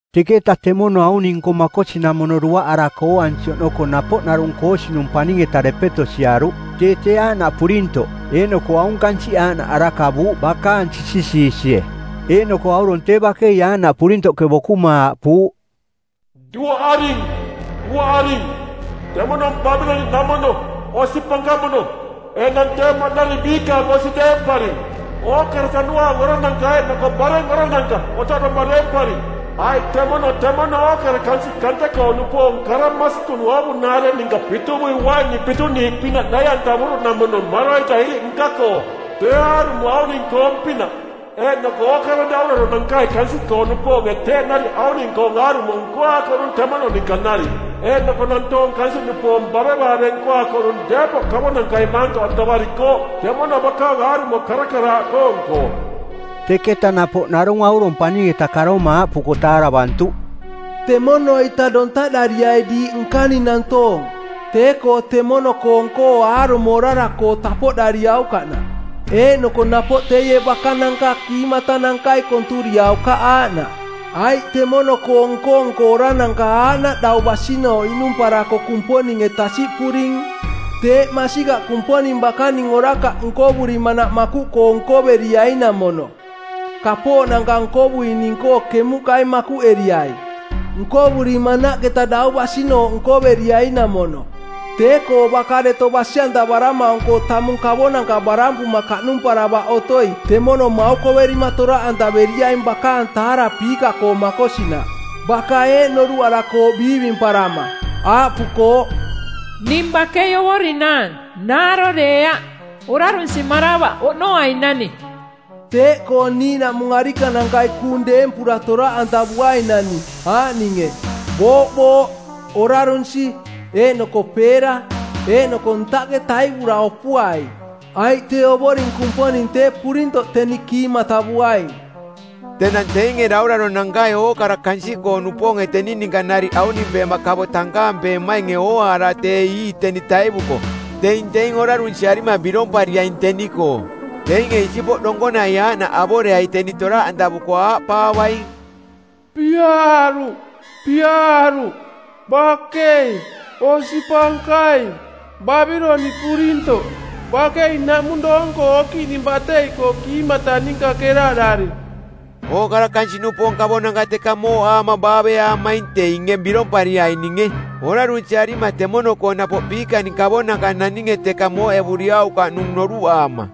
Teketa temono auning-nko makosinamono duaꞌarako ooansi oꞌnoko napoꞌ narung koosinung paning-eta depeto siaruꞌ. Tee tee aaꞌnaꞌ purintoꞌ, eeꞌnoko aung kansiꞌ aaꞌnaꞌ arakavuuꞌ bakaang sisisiisie. Eeꞌnoko aurong tee bakei aaꞌnaꞌ purintoꞌke bokuma aaꞌpuuꞌ, “Duaꞌaring, duaꞌaring, temono Babiloniꞌnamono, osi pankamono. Enang tee maꞌnari biikaang osi deemparing. Ookara tanuaang orananka eeꞌnoko bareng orananka otoꞌdoma deemparing. Aiꞌ temono temono ookara kansiꞌ kante-koo-nupoong kara masikung oovunaare ninka pituvui uaini pituniiꞌpinaꞌ nai-antavuruꞌnamono maroita iriꞌ nka-koo. Tee aarumo auning-koong-pinaꞌ. Eeꞌnoko ookara dauraronankai kansiꞌkoo-nupoonge teeꞌ nariꞌ auning-koong aarumo nkoaakoꞌnung temono ninka nariꞌ, eeꞌnoko nantoong kansiꞌnupoong bavevaave nkoaakoꞌnung deepoꞌ kavonankai maantoꞌantavarikooꞌ temono bakaang aarumo karakaraaꞌkoong-koo.” Teketa napoꞌ narung aurong paning-eta karoma aaꞌpuko taaravantuꞌ, “Temono-ita tontaꞌdariai diiꞌ nkaning nantoong, tee-koo temono-koong-koo aarumo orara-koo tapoꞌdariaukaꞌnaꞌ, eeꞌnoko napoꞌ teie bakananka kiimatanankai konturiaukaꞌ aaꞌnaꞌ. Aiꞌ temono-koo nko-nko orarananka aaꞌnaꞌ dau basinooꞌ iꞌnumparako Kumponinge tasiꞌpuring. Teeꞌ masikaꞌ Kumponing bakaning orakaꞌ nkovurimanaꞌ makuꞌkoo nkoveriaing-namono, kapooꞌnanka nkovuining-koo kemuꞌkai makuꞌeriai. Nkovurimanaꞌketa dau basinooꞌ nkoveriai-namono. Tee-koo baka deto basi-antavaramaung-koo tamung kavonanka barampuma kaꞌnumparavaꞌ otoi temono maukoverima toraꞌantaveriaing bakaang taarapiika-koo makosinaꞌ. Baka eeꞌ noruꞌarakooꞌ biivimparama, aaꞌpukooꞌ, ‘Ning bakei ovorinaang, naaro deeaꞌ, orarunsimaravaꞌ oꞌnoainani.’ Teeꞌkoo niiꞌnaꞌmung arikanankai kuung deempura toraꞌantavuainani, aaꞌninge: booꞌbooꞌ, orarunsi, eeꞌnoko peera. Eeꞌnoko ntaꞌke taivura opuai, aiꞌ tee Ovoring Kumponing tee purintoꞌ teni kiimatavuaing. “Tenang teinge dauraronankai ookara kansiꞌkoo-nupoonge teni ninka nariꞌ aunimpeema kavo tankampeemainge ooaara tee ii teni taivuko teing teing orarunsiarima birompariaing teni-koo. Teinge isipoꞌ donkonai aaꞌnaꞌ avoreai teni toraꞌantavuko aaꞌpaavaing, ‘Piaaruꞌ, piaaruꞌ, bakei, osi pankaing, Babiloniꞌ purintoꞌ. Bakei naꞌmung doong-koo okiꞌning batei-koo kiimata ninka keraꞌdari.’ Ookara kansiꞌnupoong kavonanka teka mooꞌaama baaveaamaing teinge birompariaininge, orarunsiarima temono-koo napoꞌ biikaning kavonanka naninge teka mooꞌevuriaukaꞌnung noruꞌaama.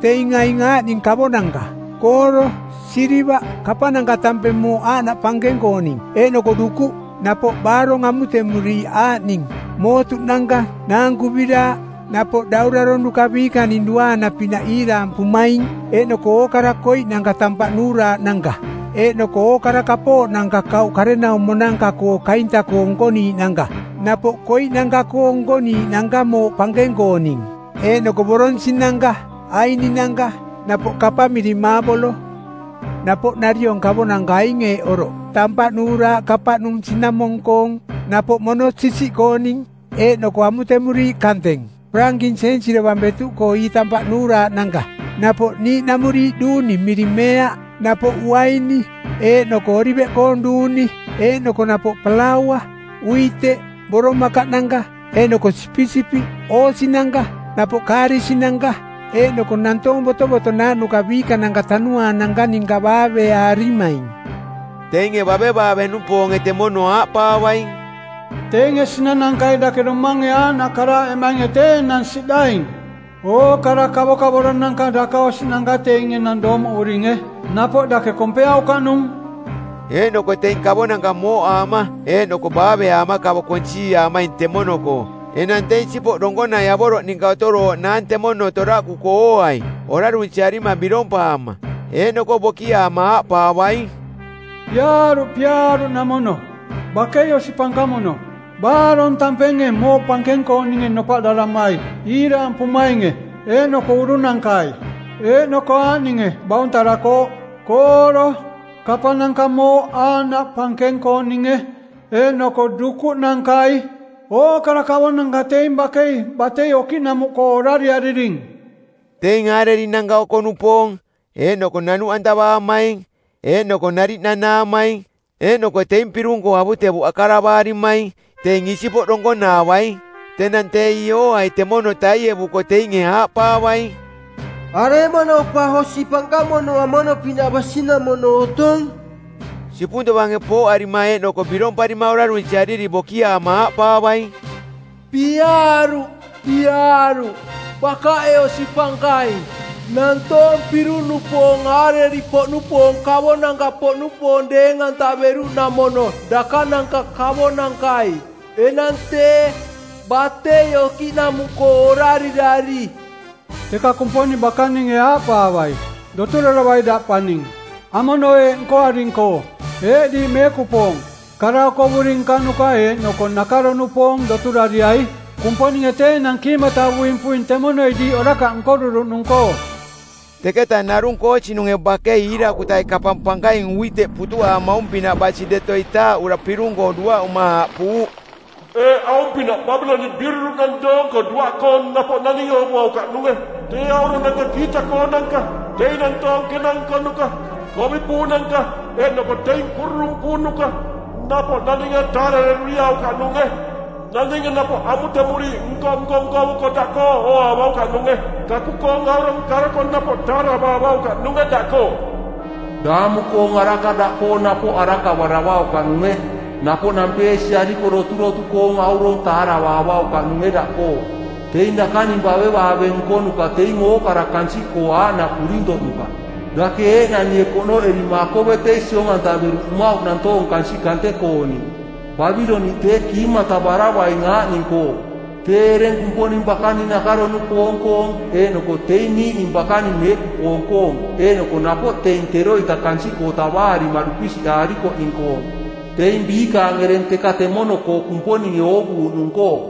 Teing aing aaꞌning kavonanka: kooro, silivaꞌ, kapananka tampeng mooꞌ aaꞌnaꞌ pankeng-kooning, eeꞌnoko dukuꞌ, napoꞌ baarong amutemuriiꞌ aaꞌning: mootuꞌnanka, naankuviraaꞌ, napoꞌ dauraronuka biikaning duaana-pinaꞌ iiraampumaing; eeꞌnoko ookara koiꞌnanka tampaꞌ nuuraaꞌnanka, eeꞌnoko ookara kapooꞌnanka kauꞌ karenaumonanka-koo kainta-koo nkoniiꞌnanka, napoꞌ koiꞌnanka-koo nkoniiꞌnanka mooꞌ pankeng-kooning, eeꞌnoko boronsi˜nanka, aininanka, napoꞌ kapang miring maabolo. Napoꞌ nariong kavonanka aing eeꞌ oroꞌ: tampaꞌ nuuraaꞌ kapaꞌnung sinamong-koong, napoꞌ mono-sisiꞌkooning, eeꞌnoko amutemuriiꞌ kanteng parankinsensi dovang betuꞌkoo ii tampaꞌ nuuraaꞌnanka, napoꞌ niiꞌnamuriiꞌ duuni miring meea, napoꞌ uaini, eeꞌnoko oliveꞌkoong duuni, eeꞌnoko napoꞌ palaua, uiteꞌ, boromakaꞌnanka, eeꞌnoko sipisipiꞌ, oosinanka, napoꞌ kaarisinanka, eeꞌnoko nantoong botovotonaaꞌnuka biikananka tanuaananka ninka baaveaarimaing. Teinge bavevaave-nupoonge temono aaꞌpaavaing, ‘Teinge sinanankai dake domange aaꞌnaꞌ karaaꞌemainge tee enang siꞌdaing. Ookara kavokavoro-nanka dakaosiꞌnanka teinge enang doomoꞌuringe, napoꞌ dake kompeaukaꞌnung.’ Eeꞌnoko teing kavonanka mooꞌaama eeꞌnoko baaveaama kavo konsiiaamaing temono-koo enang tee isipoꞌ donkonai avoroꞌ ninka otorooꞌnaang temono toraꞌkuko ooai, orarunsiarima birompaama. Eeꞌnoko bokiaama aaꞌpaavaing, ‘Piaaruꞌ, piaaruꞌnamono! Bakei osi pankamono, baarong tampenge mooꞌ pankeng-kooninge nopaꞌdaramai iiraampumainge eeꞌnoko urunankai, eeꞌnoko aaꞌninge bauntarakooꞌ: kooro, kapananka mooꞌ aaꞌnaꞌ pankeng-kooninge eeꞌnoko dukuꞌnankai. Ookara kavonanka teing bakei batei okiꞌnamuꞌkoo orariariring.’ “Teing aarerinanka oko-nupoong, eeꞌnoko nanuꞌantavaamaing, eeꞌnoko nariꞌ nanaamaing, eeꞌnoko teing pirung-koo avutevuꞌ akaravarimaing, teing isipoꞌ donkonaavaing. Tenang tee ii ooai temono taievuko teinge aaꞌpaavaing, ‘Aremono pa osi pankamono amono-pinaꞌ basinamono otong?’ Sipung tovange pooꞌarima eeꞌnoko biromparima orarunsiariri bokiaama aaꞌpaavaing, ‘Piaaruꞌ, piaaruꞌ, bakaꞌe osi pankaing. Nantoong pirung-nupoong aareri-poꞌnupoong kavonanka-poꞌnupoong deeng-antaveruꞌnamono dakananka kavonankai. Enang tee, batei okiꞌnamuꞌkoo orarirari.’ “Teka Kumponing bakaninge aaꞌpaavai, ‘Doturaravai daꞌ paning, amono eeꞌ nkoaring-koo. Eeꞌ diiꞌ meekupoong, kara okovuri nkanuka eeꞌnoko nakaro-nupoong doturariai. Kumponinge tee enang kiimatavuing puing temonoi diiꞌ orakaꞌ nkoruruꞌnung-koo.’” Teketa narung koosinunge bakei iirakutai kapang pankaing uiteꞌ putuꞌaamaung-pinaꞌ basi deto itaaꞌura pirung-koo duaꞌuma aaꞌpuuꞌ, “Eeꞌ, aung-pinaꞌ Babiloniꞌ biururuuꞌnang doonko duaꞌkoong, napoꞌ naninge oovuaukaꞌnunge. Tee auronanka kiita-koonanka, teing nantoong kena nkonuka, kovi puunanka eeꞌnoko teing kururung puunuka, napoꞌ naninge taarareruriaukaꞌnunge. Naninge napoꞌ amutemuriiꞌ nko-nko nkovuko daꞌkoo ooaavaukaꞌnunge. Kaku-koong aurong karoko napoꞌ taaravaavaukaꞌnunge daꞌkoo. Daamu-koong araka daꞌkoo napoꞌ arakavaravaukaꞌnunge. Napoꞌ nampeesiariko doturotu-koong aurong taaravaavaukaꞌnunge daꞌkoo. Teing dakaning bavevaave nkonuka teing ookara-koo kansiꞌkoo aaꞌnaꞌ purintoꞌnuka. Dake eeꞌnanie konoꞌerima akovetei siong-antaveruꞌ mmauꞌ nantoong kansiꞌ kante-kooning. Babiloniꞌ tee kiimatavaravaing aaꞌning-koo: tee ereng Kumponing bakaning nakaro-nupoong-koong eeꞌnoko teing niiꞌning bakaning meekupoong-koong eeꞌnoko napoꞌ teing teroita kansiꞌkoo tavaarima dupisiꞌaarikoꞌning-koong, teing biikaang ereng teka temono-koo Kumponinge oovuuꞌnung-koo.”